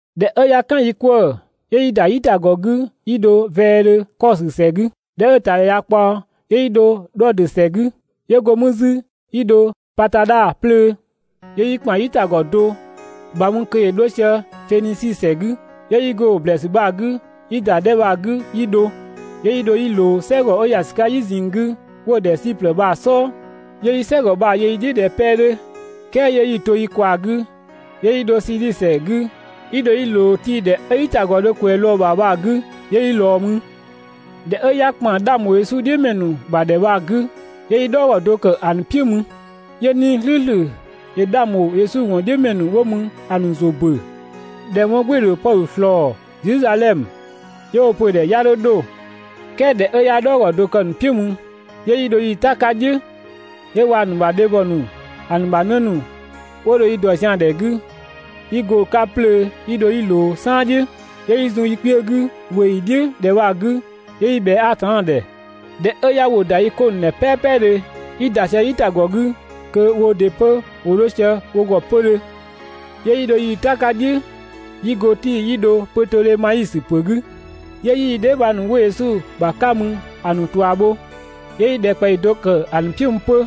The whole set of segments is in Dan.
꞊Dhɛ 'ö 'ya "kan yi 'kwëë‑, 'yö 'yi ‑da "yitagɔ 'gü 'yi dho vɛɛdhö Kɔsö ‑sɛ 'gü. ꞊Dhɛ 'ö‑ ‑tadhɛ ꞊ya ꞊kpaɔ, 'yö 'yi dho Dhɔdö ‑sɛ 'gü, 'yö go mü 'zü 'yi dho Patadha 'plöö. 'Yö 'yi ‑kpan "yitagɔ do ‑bha mü kö ‑yö 'dho sië Fenisi ‑sɛ 'gü, 'yö 'yi go‑ ‑blɛɛsü bha‑ 'gü, 'yi ‑da 'dhɛ bha‑ 'gü 'yi dho. 'Yö 'yi dho 'yi ꞊loo "sɛgɔ 'ö ‑ya ‑sü 'ka "yi ꞊zinng 'gü 'wo‑ ‑dhɛ Siplë bha‑ "sɔɔ, 'yö 'yi "sɛgɔ bha‑ yö yi "dhiʋ̈ ꞊dhɛ 'pɛ 'dhö, "kɛɛ 'yö 'yi‑ to yi ꞊kwaa‑ 'gü, 'yö 'yi dho Siidhi ‑sɛ 'gü 'yi dho 'yi ꞊loo Tii ‑dhɛ 'ö "yitagɔ dho ꞊kwɛɛ‑ lɔɔ‑ ‑bha bha‑ 'gü 'yö 'yi ꞊lɔɔ mü. ꞊Dhɛ 'ö 'ya ‑kpan 'dhang ‑bho Yesu "dhiʋ̈ ‑mɛ ‑nu ‑bha ‑dhɛ bha‑ 'gü, 'yö 'yi "dhɔɔgɔ do ‑kë ‑a ‑nu "piʋ̈ mü. 'Yö 'Nii‑ "slʋ̈ʋ̈slʋ̈ ‑yö 'dhang ‑bho Yesu ‑wɔn "dhiʋ̈ ‑mɛ ‑nu 'wo mü bha‑ ‑nu ‑zʋ ‑bö ꞊dhɛ 'wɔn "gbɩɩ‑ ‑dho Pɔdhö ꞊slɔɔ Zedhizadhɛmö, 'yö 'wo‑ pö‑ ‑dhɛ 'ya 'dho 'dho. "Kɛɛ ꞊dhɛ 'ö 'ya "dhɔɔgɔ do kë‑ ‑nu "piʋ̈ mü, 'yö 'yi dho yii‑ "ta 'ka "dhiʋ̈, 'yö waa‑ ‑nu ‑bha dhebhɔ ‑nu, ‑a ‑nu ‑bha 'në ‑nu 'wo dho yi ‑dɔ zian‑ ‑dhɛ 'gü, 'yi go‑ 'ka 'plöö 'yi dho 'yi ꞊loo "saan "dhiʋ̈, 'yö 'yi zun yi kpiö 'gü ꞊weeyi "dhiʋ̈ ‑dhɛ bha‑ 'gü 'yö 'yi ꞊bhɛa Atanna ‑dhɛ. ꞊Dhɛ 'ö 'ya ‑wʋ ‑da yi 'ko ‑nu ‑dhɛ "pɛpɛdhö, 'yi ‑da sië "yitagɔ 'gü kö woo ‑dɩ 'pö ‑wo 'dho sië wo ‑gɔ 'pödhö. 'Yö 'yi dho yii‑ "ta 'ka "dhiʋ̈ 'yi go Tii 'yi dho Pötodhemaisö ‑pö 'gü 'yö 'yi yi dheebhang ‑nu 'wo Yesu ‑bha 'ka mü ‑a ‑nu ꞊tua bho, 'yö 'yi ‑dhɛkpaɔyi do ‑kë ‑a ‑nu "piʋ̈ mü 'pö.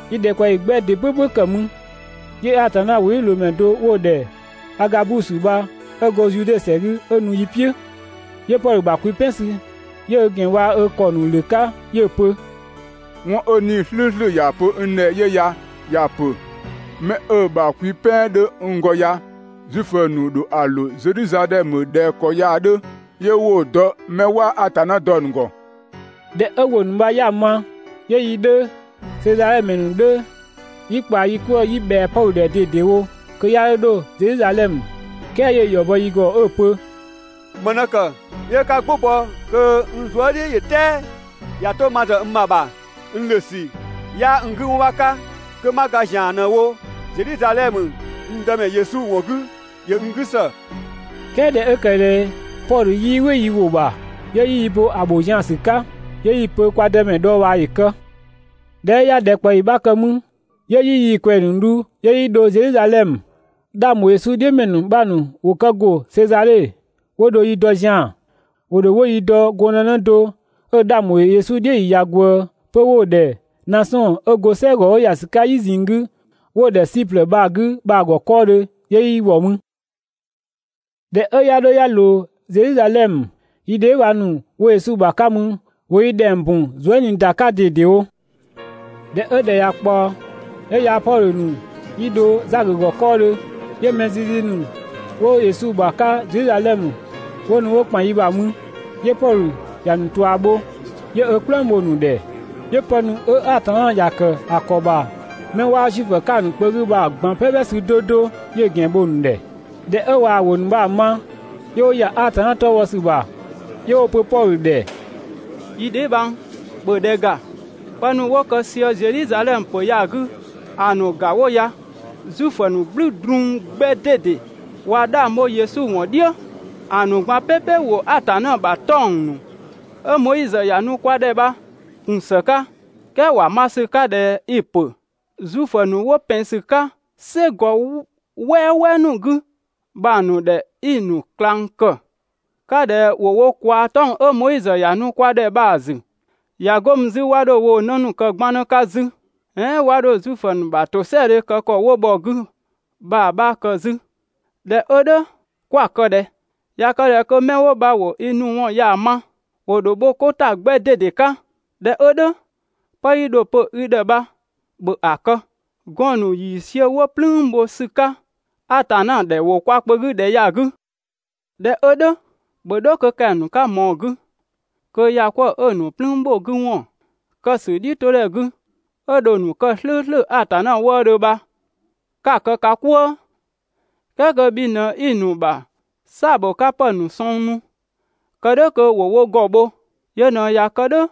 Yi ‑dhɛkpaɔyi 'gbɛ ‑dɩ "pʋ̈pʋ̈ ‑kë mü, 'yö Atanna ‑wʋdhiʋ̈loomɛ do 'wo‑ ‑dhɛ Agabusö bha 'ö go Zude ‑sɛ 'gü 'ö nu yi "piʋ̈. 'Yö Pɔdhö ‑bha kwi "pɛn sü, 'yö ö ‑gɛn waa‑ ö ‑kɔ ‑nu ‑lö 'ka 'yö‑ pö: «'Wɔn 'ö 'Nii‑ "slʋ̈ʋ̈slʋ̈ ‑ya pö n ‑dhɛ 'yö ya, ‑ya pö: «'Mɛ 'ö‑ ‑bha kwi "pɛn 'dhö n ‑gɔ ya, Zuifö ‑nu ‑dho ‑a ‑lö Zedhizadhɛmö ꞊dhɛ ‑kɔ ya‑ 'dhö, 'yö 'wo‑ dɔ 'mɛ 'waa Atanna dɔ‑ ‑nu ‑gɔ».» ꞊Dhɛ 'ö ‑wʋ ‑nu bha 'ya‑ ma, 'yö yi 'dhö, Sezadhe ‑mɛ ‑nu 'dhö, 'yi ꞊kpaa yi 'kwëë‑ 'yi ꞊bhɛa Pɔdhö ‑dhɛ ꞊dedewo kö 'ya 'dho 'dho Zedhizadhɛmö, "kɛɛ 'yö‑ ‑yɔ bɔ yi ‑gɔ 'ö‑ pö: «‑Më ꞊në ‑kë 'yö 'ka "gbʋ bɔ kö n zuë" "dhiʋ̈ ‑yö "tɛɛ? ꞊Ya 'to ma ‑zë n ‑bha ‑bha n ‑lö ‑sü 'yaa n 'gü 'wɔn 'bha 'ka, 'kö 'ma ga ‑zian ꞊në‑ wo Zedhizadhɛmö n Dëmɛ Yesu ‑wɔn 'gü ‑yö n 'gü ‑së.» "Kɛɛ ꞊dhɛ 'ö ‑kë ꞊dhɛ Pɔdhö 'yii "wɩ yi ‑wʋ ‑bha, 'yö 'yi yi bo ‑a ‑bho zian‑ ‑sü 'ka, 'yö 'yi‑ pö kwa Dëmɛ dhɔɔbhaa ‑yö kë. ꞊Dhɛ 'ö 'ya ‑dhɛkpaɔyi 'bha kë 'mü, 'yö 'yi yii‑ ꞊kwɛɛ‑ ‑nu dhu 'yö 'yi dho Zedhizadhɛmö. 'Dhang ‑bho Yesu "dhiʋ̈ ‑mɛ ‑nu 'bha ‑nu ‑wo kë ‑go Sezadhe, 'wo dho yi dɔ zian‑. ‑Wo ‑dho 'wo yi dɔ gɔndënë do 'ö‑ 'dhang ‑bho Yesu "dhiʋ̈ ‑yi ꞊ya ꞊gwëë 'pö 'wo‑ ‑dhɛ Nasɔn 'ö go "sɛgɔ 'ö ‑ya ‑sü 'ka "yi ꞊zinng 'gü 'wo‑ ‑dhɛ Siplë bha‑ 'gü bha‑ ‑gɔ 'kɔɔdhö 'yö 'yi ‑wɔ mü. ꞊Dhɛ 'ö 'ya 'dho 'ya ꞊loo Zedhizadhɛmö, yi dheebhang ‑nu 'wo Yesu ‑bha 'ka mü ‑wo yi ‑dhɛng bun zuë" ꞊nii ‑da ‑sü 'ka ꞊dedewo. ꞊Dhɛ 'ö ‑dhɛ ꞊ya ꞊kpaɔ, 'yö yaa‑ Pɔdhö ‑nu 'yi dho Zakö ‑gɔ 'kɔɔdhö, 'yö mɛ zizi ‑nu 'wo Yesu ‑bha 'ka Zedhizadhɛmö 'wo nu 'wo ‑kpan yi ‑bha mü. 'Yö Pɔdhö ‑ya ‑nu ꞊tua bho, 'yö ö "kplëng bho‑ ‑nu ‑dhɛ, 'yö pë ‑nu 'ö Atanna ‑ya ‑kë ‑a ‑kɔ ‑bha 'mɛ 'waa Zuifö 'ka‑ ‑nu kpö 'gü bha‑ ꞊gban "pɛpɛ sü 'do 'do 'yö‑ ‑gɛn bho‑ ‑nu ‑dhɛ. ꞊Dhɛ 'ö ꞊waa‑ ‑wʋ ‑nu bha‑ ma, 'yö 'wo ‑ya Atanna 'tɔ bhɔ ‑sü ‑bha. 'Yö 'wo‑ pö Pɔdhö ‑dhɛ: «Yi dheebhang, ‑bhö ‑dhɛ ‑ga, pë ‑nu 'wo kë sië Zedhizadhɛmö ‑pö ya‑ 'gü ‑a ‑nu ‑ga 'wo ya: Zuifö ‑nu "gblü drun 'gbɛ ꞊dede ꞊wa 'dhang bho Yesu ‑wɔn "dhiʋ̈. ‑A ‑nu ꞊gban "pɛpɛ ‑wo Atanna ‑bha 'tɔng‑ ‑nu 'ö Moizö ‑ya nu kwa ‑dhɛ bha‑ ‑kun ‑së 'ka. "Kɛɛ ‑wa ma ‑sü 'ka ꞊dhɛ i‑ ‑pö Zuifö ‑nu 'wo ‑pɛn ‑sü 'ka "sɛgɔ "wɛɛwɛɛ ‑nu 'gü bha‑ ‑nu ‑dhɛ 'i‑ ‑nu ꞊klang ‑kë 'ka ꞊dhɛ ‑wo wo kwaa‑ 'tɔng‑ 'ö Moizö ‑ya nu kwa ‑dhɛ bha‑ ‑zü, ꞊ya 'go mü 'zü 'wa 'dho woo‑ 'në ‑nu kë 'gbannë 'ka 'zü "ɛɛn 'wa 'dho Zuifö ‑nu ‑bha ‑tosɛadhe kë ‑kɔ 'wo bhɔ‑ 'gü bha‑ 'bha kë 'zü. ꞊Dhɛ 'ö "dhʋ̈ 'kwa‑ kë ꞊dhɛ? ꞊Ya kë ꞊dhɛ kö 'mɛ 'wo bha ‑wo i nu ‑wɔn ya‑ ma, ‑wo ‑dho bho 'ko ‑ta 'gbɛ ꞊dede 'ka. ꞊Dhɛ 'ö "dhʋ̈, 'pë 'yi dho‑ pö i ‑dhɛ bha ‑bhö ‑a kë! Gɔɔn‑ ‑nu ‑yiisiö 'wo "plüün bho ‑sü 'ka Atanna ‑dhɛ ‑wo kwa kpö 'gü ‑dhɛ ya‑ 'gü. ꞊Dhɛ 'ö "dhʋ̈ ‑bhö 'dho kö kɛng‑ ‑nu 'ka ꞊mɔɔ‑ 'gü kö ‑bhɔkwëëdhe 'ö‑ ‑nu "plüün ‑bho 'gü ‑wɔn kë ‑sü "dhiʋ̈todhɛ 'gü, 'ö dho‑ ‑nu kë "slʋ̈ʋ̈slʋ̈ Atanna wëëdhö bha 'ka‑ kë ka "kwëë. "Kɛɛ kö bhi ꞊në 'i‑ ‑nu ‑bha "saa‑ ‑bho 'ka ‑pë ‑nu sɔng nu kë "dhʋ̈ kö ‑wo wo ‑gɔ bho. Yö ꞊në ꞊ya kë "dhʋ̈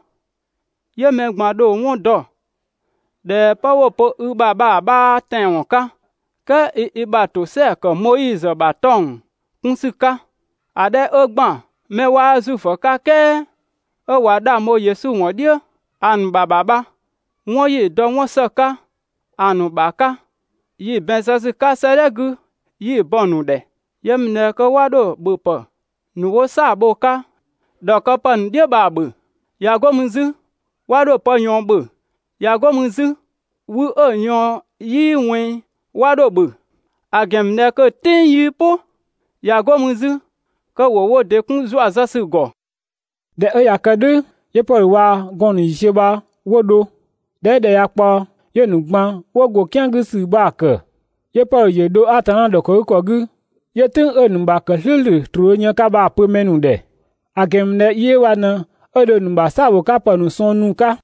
'yö mɛ ꞊gban‑ dho‑ 'wɔn dɔ ꞊dhɛ 'pë 'wo‑ pö i ‑bha bha‑ ‑bha 'yaa tɛanwɔn 'ka, "kɛɛ i i ‑bha ‑tosɛa ‑kë Moizö ‑bha 'tɔng‑ 'kun ‑sü 'ka. ‑A 'dhɛ 'ö ‑gban 'mɛ 'waa Zuifö 'ka "kɛɛ 'ö ꞊wa 'dhang bho Yesu ‑wɔn "dhiʋ̈ ‑a ‑nu ‑bha ‑bha bha, 'wɔn 'yi‑ dɔ 'wɔn ‑së 'ka ‑a ‑nu ‑bha 'ka, yi‑ ‑bɛn zë ‑sü 'ka 'sëëdhɛ 'gü 'yi‑ bɔ‑ ‑nu ‑dhɛ. Yö ‑mü ꞊dhɛ kö 'wa 'dho ‑bhöpë ‑nu 'wo "saa‑ bho‑ 'ka ‑dhɔkëpë ‑nu "dhiʋ̈ bha‑ ‑bhö. ꞊Ya 'go mü 'zü 'wa 'dho pë ꞊yɔɔn ‑bhö, ꞊ya 'go mü 'zü wü 'ö‑ ꞊yɔɔn 'yii ꞊wɛnng 'wa 'dho‑ ‑bhö, ‑a ‑gɛn ‑mü ꞊dhɛ kö‑ "tɩng 'yii "pʋ. ꞊Ya 'go mü 'zü kö ‑wo wo ‑dɩ 'kun ‑zua zë ‑sü ‑gɔ. ꞊Dhɛ 'ö ꞊ya kë "dhʋ̈ 'yö Pɔdhö waa‑ gɔɔn‑ ‑nu ‑yiisiö bha 'wo dho. ꞊Dhɛ 'ö ‑dhɛ ꞊ya ꞊kpaɔ, 'yö‑ ‑nu ꞊gban 'wo ‑gɔ "kian 'gü ‑sü bha‑ ‑kë. 'Yö Pɔdhö ‑yö dho Atanna ‑dhɔkëgükɔ 'gü, 'yö "tʋ̈ng 'ö‑ ‑nu ‑bha ‑kë "slʋ̈ʋ̈slʋ̈ ‑troo dho yën‑ 'ka bha‑ pö mɛ ‑nu ‑dhɛ, ‑a ‑gɛn ‑mü ꞊dhɛ yi 'ö bha ꞊në 'ö dho‑ ‑nu ‑bha "saabhokapë ‑nu sɔng nu‑ 'ka.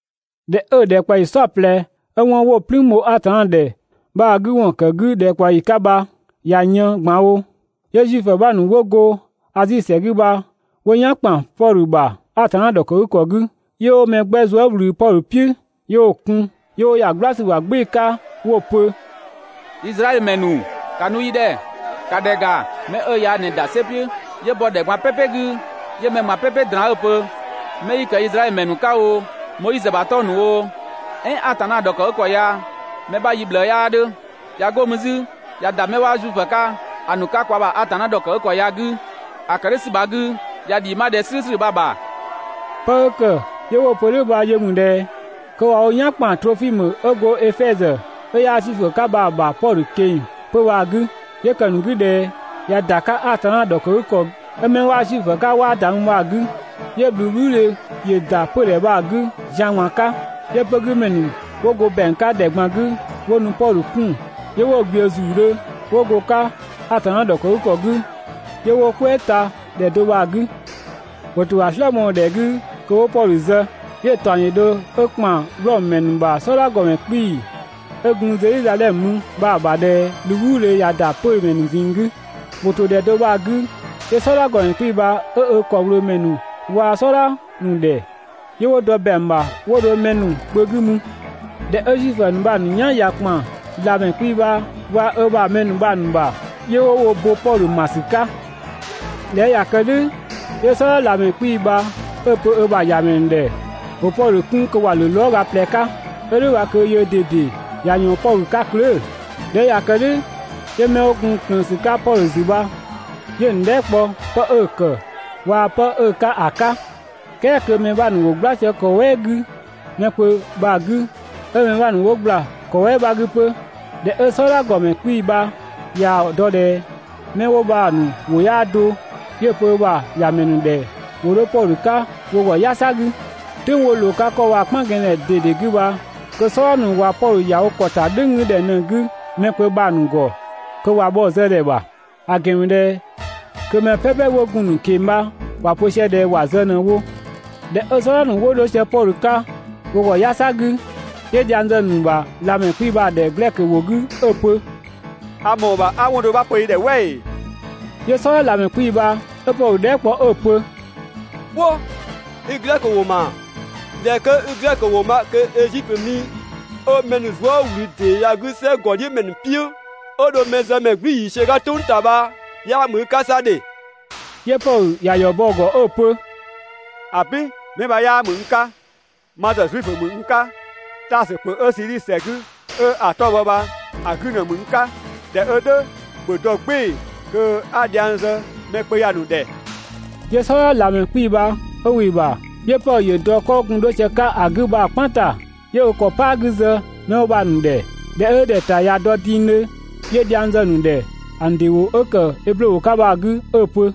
꞊Dhɛ 'ö‑ ‑dhɛkpaɔyi "saɔplɛ ('ö 'wɔn 'wo‑ "plüün bho Atanna ‑dhɛ bha‑ 'gü ‑wɔn ‑kë 'gü ‑dhɛkpaɔyi 'ka bha) bha ꞊ya yën ꞊gban wo, 'yö Zuifö ‑nu 'bha ‑nu 'wo go Azi ‑sɛ 'gü bha 'wo "yan ‑kpan Pɔdhö ‑bha Atanna ‑dhɔkëgükɔ 'gü, 'yö 'wo mɛ 'gbɛ zuë" ꞊wlü Pɔdhö "piʋ̈ 'yö 'wo‑ kun. 'Yö 'wo ‑ya "gbla ‑sü ‑bha "gbɩɩ‑ 'ka 'wo‑ pö: «Izraɛdhö ‑mɛ ‑nu, ‑ka nu yi ‑dhɛ! ‑Ka ‑dhɛ ‑ga, 'mɛ 'ö ya ꞊në ‑da "sɛ "piʋ̈ 'yö bɔ ‑dhɛ ꞊gban "pɛpɛ 'gü 'yö mɛ ꞊gban "pɛpɛ ꞊draan 'ö pö: «'Mɛ 'yi ‑kë Izraɛdhö ‑mɛ ‑nu 'ka oo, Moizö ‑bha 'tɔng‑ ‑nu oo "ɛɛn Atanna ‑dhɔkëgükɔ ya yi 'bha yi ꞊bhlëë 'yaa 'dhö!» ꞊Ya 'go mü 'zü ꞊ya ‑da 'mɛ 'waa Zuifö 'ka‑ ‑nu 'ka kwa ‑bha Atanna ‑dhɔkëgükɔ ya‑ 'gü, 'yö‑ ‑kë "dhʋ̈ ‑sü bha‑ 'gü ꞊ya ‑dhɛ 'ö "slʋ̈ʋ̈slʋ̈ bha‑ ‑kë ‑dhiisü.» ['Pë 'ö ‑kë 'yö 'wo‑ pö "dhʋ̈ bha yö ‑mü ꞊dhɛ kö ꞊wa wo "yan ‑kpan Trofimö 'ö go Efɛzö 'ö 'yaa Zuifö 'ka bha‑ ‑bha Pɔdhö ꞊keng‑ 'pö‑ bha‑ 'gü, 'yö ‑kë ‑nu 'gü ꞊dhɛ ꞊ya ‑da 'ka Atanna ‑dhɔkëgükɔ ('ö 'mɛ 'waa Zuifö 'ka 'waa ‑da mü bha‑) 'gü.] 'Yö ꞊bhluubhluudhe ‑yö ‑da 'pödhɛ bha‑ 'gü zian ꞊gban 'ka, 'yö 'pögümɛ ‑nu 'wo go ‑bɛang 'ka ‑dhɛ ꞊gban 'gü 'wo nu 'wo Pɔdhö kun 'yö 'wo‑ ꞊gbiʋ̈ ‑zuudhö 'wo go‑ 'ka Atanna ‑dhɔkëgükɔ 'gü, 'yö 'wo‑ "kwɛɛ ta ‑dhɛ do bha‑ 'gü. ‑Wo ‑to ‑a "slë mɔɔ‑ ‑dhɛ 'gü kö 'wo Pɔdhö zë, 'yö‑ ‑taɔng ‑yö dho 'ö ‑kpan Wlɔmö ‑mɛ ‑nu ‑bha "sɔdha ‑gɔmɛ 'kpii‑ 'ö gun Zedhizadhɛmö mü bha‑ ‑bha ꞊dhɛ ꞊bhluubhluudhe ꞊ya ‑da 'pömɛ ‑nu ꞊zinng 'gü. ‑Wo ‑to ‑dhɛ do bha‑ 'gü 'yö "sɔdha ‑gɔmɛ 'kpii‑ bha 'ö ö ‑kɔwlöömɛ ‑nu waa‑ "sɔdha ‑nu ‑dhɛ, 'yö 'wo dɔ ‑bɛang ‑bha 'wo dho mɛ kpö 'gü mü. ꞊Dhɛ 'ö Zuifö ‑nu bha‑ ‑nu "yan ꞊ya ‑kpan ꞊lamɛ 'kpii‑ bha waa‑ ö ‑bha mɛ ‑nu bha‑ ‑nu ‑bha, 'yö 'wo wo bo Pɔdhö ‑ma ‑sü 'ka. ꞊Dhɛ 'ö ꞊ya kë "dhʋ̈ 'yö "sɔdha ꞊lamɛ 'kpii‑ bha 'ö‑ pö ö ‑bha ‑yamɛ ‑nu ‑dhɛ ‑wo Pɔdhö 'kun kö ‑wa ‑lö lɔɔga ꞊plɛ 'ka, 'ö "dhʋ̈ bha kö yöö ꞊dede ꞊ya ꞊yɔɔn Pɔdhö 'ka klöö‑. ꞊Dhɛ 'ö ꞊ya kë "dhʋ̈ 'yö 'mɛ 'wo gun ꞊klëën ‑sü 'ka Pɔdhö ‑zü bha 'yö‑ ‑nu dhɛɛ" kpɔ 'pë 'ö‑ ‑kë waa‑ 'pë 'ö‑ 'ka ‑a ka. "Kɛɛ kö mɛ 'bha ‑nu ‑wo "gbla sië ‑kɔ "wɛɛ 'gü mɛ kpö bha‑ 'gü, 'ö mɛ 'bha ‑nu ‑wo ‑gbla ‑kɔ "wɛɛ 'bha 'gü 'pö. ꞊Dhɛ 'ö "sɔdha ‑gɔmɛ 'kpii‑ bha ꞊yaa‑ dɔ ꞊dhɛ 'mɛ 'wo bha‑ ‑nu ‑wʋ 'yaa do, 'yö‑ pö ö ‑bha ‑ya ‑mɛ ‑nu ‑dhɛ ‑wo 'dho Pɔdhö 'ka wo ‑gɔ "yasa 'gü. "Tʋ̈ng 'wo ꞊loo‑ 'ka 'kɔ bha‑ "kpan gɛnng‑ ‑dhɛ ꞊dede 'gü bha kö "sɔdha ‑nu ꞊wa Pɔdhö ‑ya wo ‑kɔ ‑ta "dhʋ̈ng 'gü ‑dhɛ ꞊në‑ 'gü mɛ kpö bha‑ ‑nu ‑gɔ kö ꞊wa bhɔ‑ zë ‑dhɛ ‑bha. ‑a ‑gɛn ‑mü ꞊dhɛ kö mɛ "pɛpɛ 'wo gun‑ ‑nu ꞊keng‑ bha ‑wa pö sië ꞊dhɛ ‑wa zë ꞊në‑ wo. ꞊Dhɛ 'ö "sɔdha ‑nu 'wo 'dho sië Pɔdhö 'ka wo ‑gɔ "yasa 'gü, 'yö dhiang zë‑ ‑nu ‑bha ꞊lamɛ 'kpii‑ bha ‑dhɛ glɛkö ‑wʋ 'gü 'ö‑ pö: «A ‑mɔɔ ‑bha 'a 'wɔn do 'bha pö i ‑dhɛ "wɛ ‑ee?» 'Yö "sɔdha ꞊lamɛ 'kpii‑ bha 'ö Pɔdhö dhɛɛ" kpɔ 'ö‑ pö: «"Kwo! I glɛkö ‑wʋ ‑ma? ꞊Dhɛ 'kö 'i glɛkö ‑wʋ ma kö Ezitö mi 'ö mɛ ‑nu zuë" ꞊wlü ‑dee ya‑ 'gü "sɛgɔdhiʋ̈mɛ ‑nu "piʋ̈ 'ö dho mɛzëmɛ "gblü ‑yiisiö 'ka "tʋng ‑ta bha 'yaa ‑mü i 'ka 'sa!» 'Yö Pɔdhö ‑ya ‑yɔ bɔ‑ ‑gɔ 'ö‑ pö: «‑Abin, 'mɛ bha 'yaa ‑mü n 'ka, ma ‑zë Zuifö ‑mü n 'ka, Taasö ‑pö 'ö Sidhisi ‑sɛ 'gü 'ö‑ 'tɔ‑ bhɔ bha‑ 'gü ‑në ‑mü n 'ka. ꞊Dhɛ 'ö "dhʋ̈ ‑bhö dɔ "gbɩɩ‑ kö 'a dhiang zë mɛ kpö ya‑ ‑nu ‑dhɛ.» 'Yö "sɔdha ꞊lamɛ 'kpii‑ bha 'ö ‑wɩ ‑bha. 'Yö Pɔdhö ‑yö dɔ 'kɔ 'wo gun 'dho sië‑ 'ka ‑a 'gü bha‑ "kpan ‑ta 'yö ö ‑kɔ "paa 'gü zë 'mɛ 'wo bha‑ ‑nu ‑dhɛ. ꞊Dhɛ 'ö ‑dhɛ ‑ta ꞊ya dɔ dingdhö, 'yö dhiang zë‑ ‑nu ‑dhɛ ‑a ‑nu ‑dɩ ‑wʋ 'ö ‑kë eblö ‑wʋ 'ka bha‑ 'gü 'ö‑ pö: